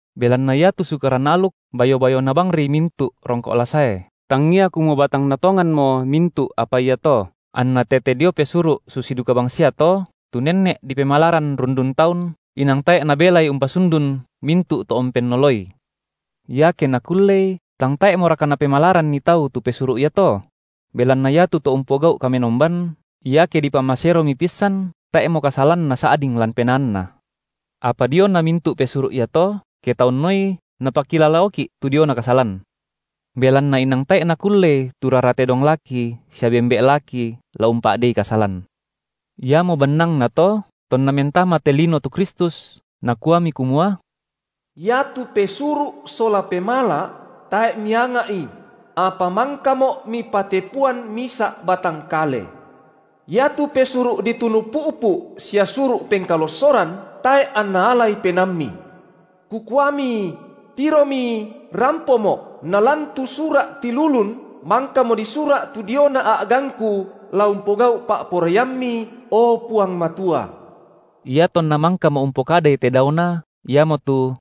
Belanna iatu Sukaran aluk bayo-bayona bangri mintu’ rongko’ la sae, tangia kumua batangna tonganno mintu’ apa iato, anna tete dio pesuru’ susi duka bangsiato, tu nenne’ dipemalaran rundun taun, inang tae’ nabelai umpasundun mintu’ to umpennoloi. Iake nakullei, tang tae’moraka napemalaranni tau tu pesuru’ iato? Belanna iatu to umpogau’ kamenomban, iake dipamaseromi pissan, tae’mo kasalan nasa’ding lan penaanna. Apa diona mintu’ pesuru’ iato, ke taunoi napakilalaoki’ tu diona kasalan. Belanna inang tae’ nakullei tu rara tedong laki sia bembe’ laki la umpa’dei kasalan. Iamo bannangnato tonna mentama te lino tu Kristus, Nakuami kumua: Iatu pesuru’ sola pemala’ tae’ Mianga’i, – apa mangkaMo’ Mipatepuan misa’ batang kale –. Iatu pesuru’ ditunu pu’pu’ sia suru’ pengkalossoran, tae’ anna alai penaamMi. Kukuami: Tiromi, rampoMo’, nalan tu sura’ tilulun mangkamo disura’ tu diona a’gangKu la umpogau’ pa’poraiamMi, o Puang Matua. Iatonna mangkamo umpokadai te daona, iamotu: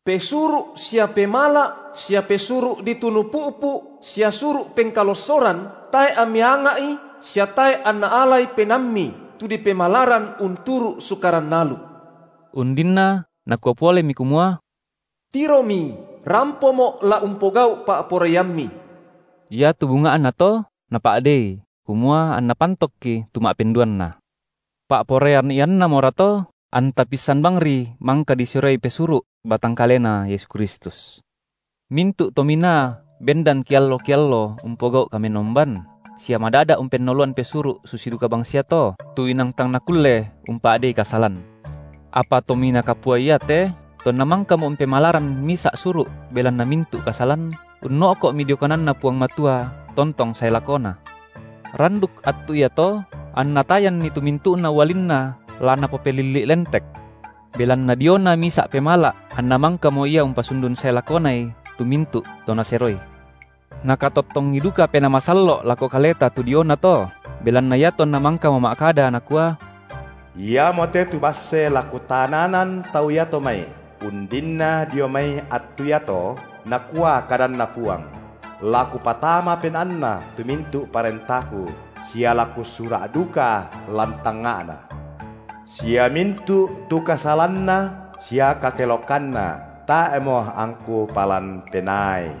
Pesuru’ sia pemala’ sia pesuru’ ditunu pu’pu sia suru’ pengkalossoran tae’ amMi anga’i sia tae’ anna alai penaamMi – tu dipemalaran unturu’ Sukaran aluk –. Undinna Nakua polemi kumua: Tiromi, rampoMo’ la umpogau’ pa’poraiamMi. Iatu bunga’nato Napa’dei, kumua anNa pantokki tu ma’penduanna. Pa’poraian iannamorato anta pissan bangri mangka diseroi pesuru’ batang kaleNa Yesu Kristus. Mintu’ tominaa bendan kiallo-kiallo umpogau’ kamenomban, sia madada’ umpennoloan pesuru’ susi duka bangsiato, tu inang tang nakulle umpa’dei kasalan. Apa Tominaa Kapua iate, tonna mangkamo umpemalaran misa’ suru’ belanna mintu’ kasalan, unno’komi dio kananNa Puang Matua tontong sae lakona. Randuk attu iato anNa tayanni tu mintu’na ualinNa la Napopelilli’ lentek. Belanna diona misa’ pemala’ anNa mangkamo Ia umpasundun sae lakonai tu mintu’ to Naseroi. Nakatottongi duka Penaa Masallo’ lako kaleta tu dionato, belanna iatonna mangkamo ma’kada, Nakua: Iamote tu basse la Kutananan tau iato mai, undinna dio mai attu iato, nakua kadanNa Puang; la Kupatama penaanna tu mintu’ parentaKu, sia la Kusura’ duka lan tangnga’na; sia mintu’ tu kasalanna sia kakelokanna tae’mo angKu palan penaai.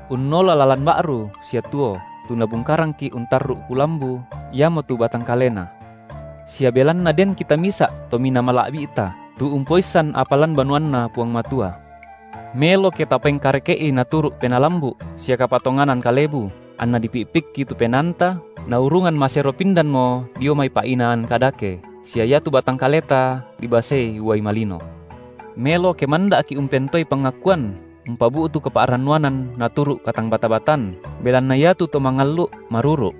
unnola lalan ba’ru sia tuo tu Nabungkarangki’ untarru’ kulambu, iamotu batang kaleNa; sia belanna den kita misa’ Tominaa mala’bi’ta, tu umpoissan apa lan banuanNa Puang Matua. Melo ke tapengkareke’i naturu’ penaa lambu’ sia kapatonganan kalebu, anna dipi’pikki tu penaanta, naurungan masero pindanmo dio mai pa’inaan kadake, sia iatu batang kaleta dibasei uai malino. Melo ke manda’ki’ umpentoei pangakuan umpabu’tu kapa’rannuanan naturu’ katangbata-batan, belanna iatu Tomangallu’ maruru’.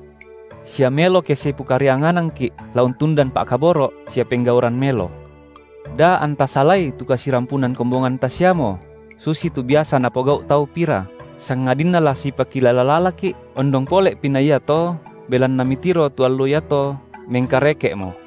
Sia melo ke sipokarianganangki’ la untundan pa’kaboro’ sia penggauran melo. Da anta salai tu kasirampunan kombonganta siamo, susitu biasa napogau’ tau pira, sangadinna la sipakilala-lalaki’, ondong pole’pi na iato belanna mitiro tu allo iato mengkareke’mo.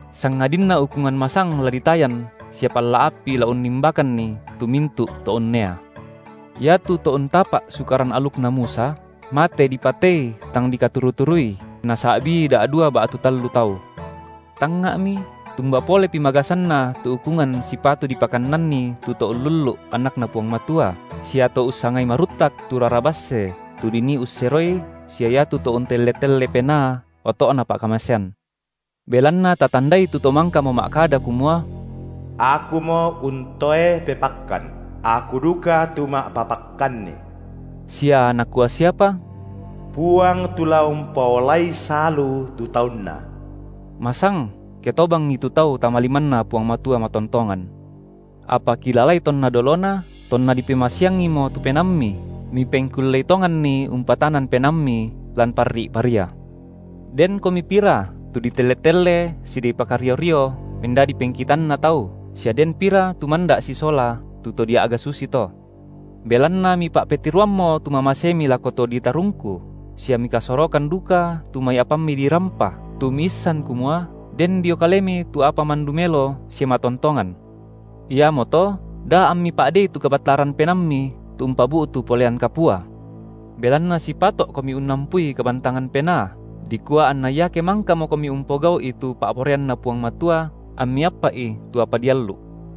sangadinna ukungan masang la ditayan sia palla api la unnimbakanni tu mintu’ to unnea. Iatu to untapa’ sukaran alukna Musa, mate dipatei tang dikaturu-turui, ke nasa’bii da’dua ba’tu tallu tau. Tangnga’mi, tumba polepi magasanna tu ukungan sipatu dipakannanni tu to ullullu’ Anakna Puang Matua, sia to ussangai maruttak tu rara basse tu dinii usseroi sia iatu to untelle-telle Penaa oto’na pa’kamasean. Belanna tatandai tu To mangkamo ma’kada kumua: Akumo untoe pepakkan; Aku duka tu ma’papakkanni, sia Nakua siapa: Puang tu la umpaolai salu tu taunNa. Masang, ke tobangi tu tau tama limanNa Puang Matua matontongan. Apa kilalai tonna dolona, tonna dipemasiangimo tu penaammi, mipengkullei tonganni umpatanan penaammi lan parri’ paria; denkomi pira tu ditelle-telle sia dipakario-rio mendadi pengkitanna tau, sia den pira tu manda’ sisola tu to dia’ga susito. Belanna mipa’petiroammo tu mamasemi lako to ditarungku, sia mikasorokan duka tu mai apammi dirampa, tu miissan kumua, den dio kalemi tu apa mandu melo sia matontongan. Iamoto, da ammi pa’dei tu kabattaran penaammi tu umpabu’tu polean kapua. Belanna sipato’komi unnampui kabantangan penaa, dikua anna iake mangkamokomi umpogau’i tu pa’poraianNa Puang Matua, ammi appa’i tu apa diallu’.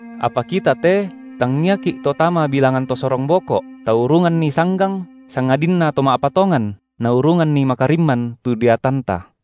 Apa kita te tangiaki’ to tama bilangan to sorong boko’, taurunganni sanggang, sangadinna to ma’patongan, naurunganni makarimman tu deatanta.